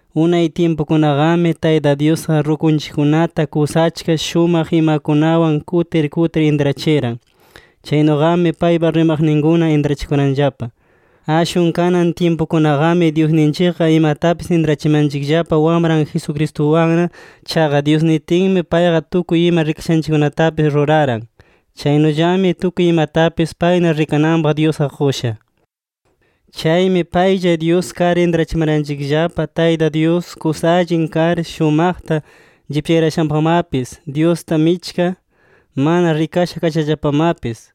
Unay tyimpukunaqami, Tayta Dyusqa rukunchikkunata kusa achka shumaq imakunawan kutir kutir intrachiran. Chaynuqami paypa rimaqninkuna intrachikuranllapa. Ashwan kanan tyimpukunaqami, Dyusninchikqa imatapis intrachimanchikllapa Wamran Jesucristuwanna. Chaqa Dyus nitinmi payqa tukuy ima rikayashanchikkunatapis ruraran. Chaynullami tukuy imatapis payna rikananpaq Dyusqa qusha. Chaymi paylla Dyus kar, intrachimanchikllapa Taytan Dyus kusa allin kar shumaqta llipyarayashanpaqmapis, Dyusta michka mana rikasha kashallapamapis.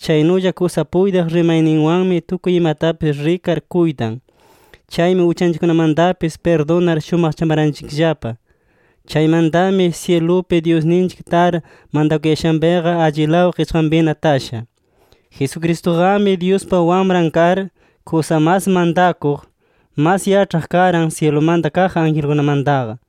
Chaynulla kusa puytiq rimayninwanmi tukuy imatapis rikar kuytan. Chaymi uchanchikkunamantapis pirdunar shumaqchamaranchikllapa. Chaymantami syilupi Dyusninchik tar mantakuyashanpiqa, allilaw qichqanpina tasha. Jesucristuqami Dyuspa Wamran kar, kusa mas mantakuq, mas yaĉhaq karan syilumanta kaq angelkunamantaqa.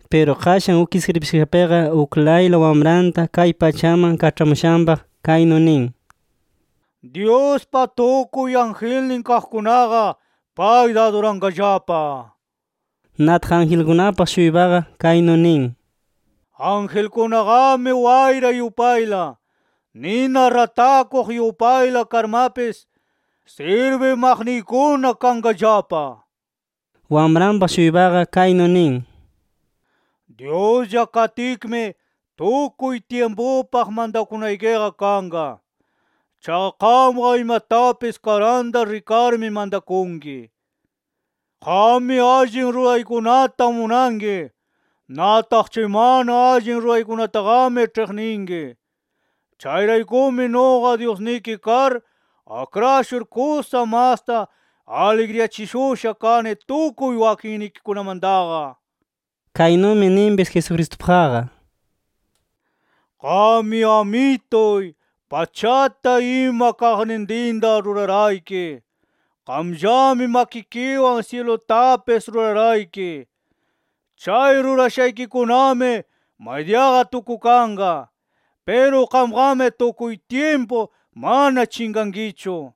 Piru qashan uk iskribikashapiqa, uklayla Wamranta kay pachaman kaĉhamushanpaq, kaynu nin: “Dyuspa tukuy angelnin kaqkunaqa, payta aduranqallapa” nir. Nataq angelkunapaq-shuypaqa, kaynu nin: “Angelkunaqami wayra yupayla, nina ratakuq yupayla karmapis, sirbimaqniykuna kanqallapa” nir. Wamranpaq-shuypaqa, kaynu nin: “Dyuslla katkimi, tukuy tyimpupaq mantakunaykiqa kanqa. Chaqa qamqa imatapis karanta rikarmi mantakunki”. “Qammi allin ruraykunata munanki. Nataq chay mana allin ruraykunataqami ĉhiqninki. Chayraykumi nuqa Dyusniki kar akrashur, kusa masta aligriyachishusha kani tukuy wakinnikikunamantaqa” nir. Kaynumi ninpis Jesucristupaqqa: “Qammi Amituy, pachata ima kaqnintinta rurarayki. Qamllami makikiwan syilutapis rurarayki. Chay rurashaykikunami maydiyaqa tukukanqa. Piru qamqami tukuy tyimpu, mana chinqankichu.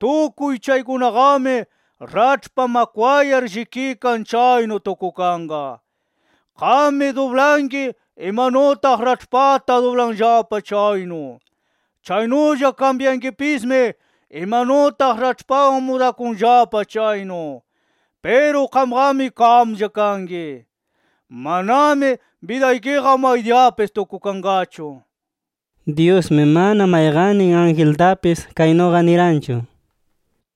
Tukuy chaykunaqami raĉhpa makwayar llikikan chaynu tukukanqa. Qammi dublanki, imanutaq raĉhpata dublanllapa chaynu. Chaynulla kambyankipismi imanutaq raĉhpawan mudakunllapa chaynu. Piru qamqami, qamlla kanki. Manami bidaykiqa maydiyapis tukukanqachu” nir. Dyusmi mana mayqannin angeltapis kaynuqa niranchu: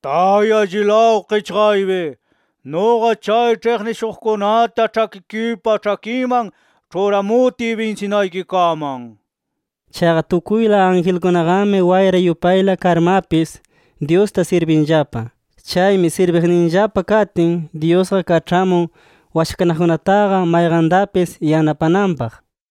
“Tay allilaw qichqaypi, nuqa chay ĉhiqnishuqkunata ĉhakikipa ĉhakinman ĉhuramutiy binsinaykikaman” nirqa. Chaqa tukuyla angelkunaqami wayra yupayla karmapis, Dyusta sirbinllapa. Chaymi sirbiqninllapa katin, Dyusqa kaĉhamun washakanaqkunataqa mayqantapis yanapananpaq.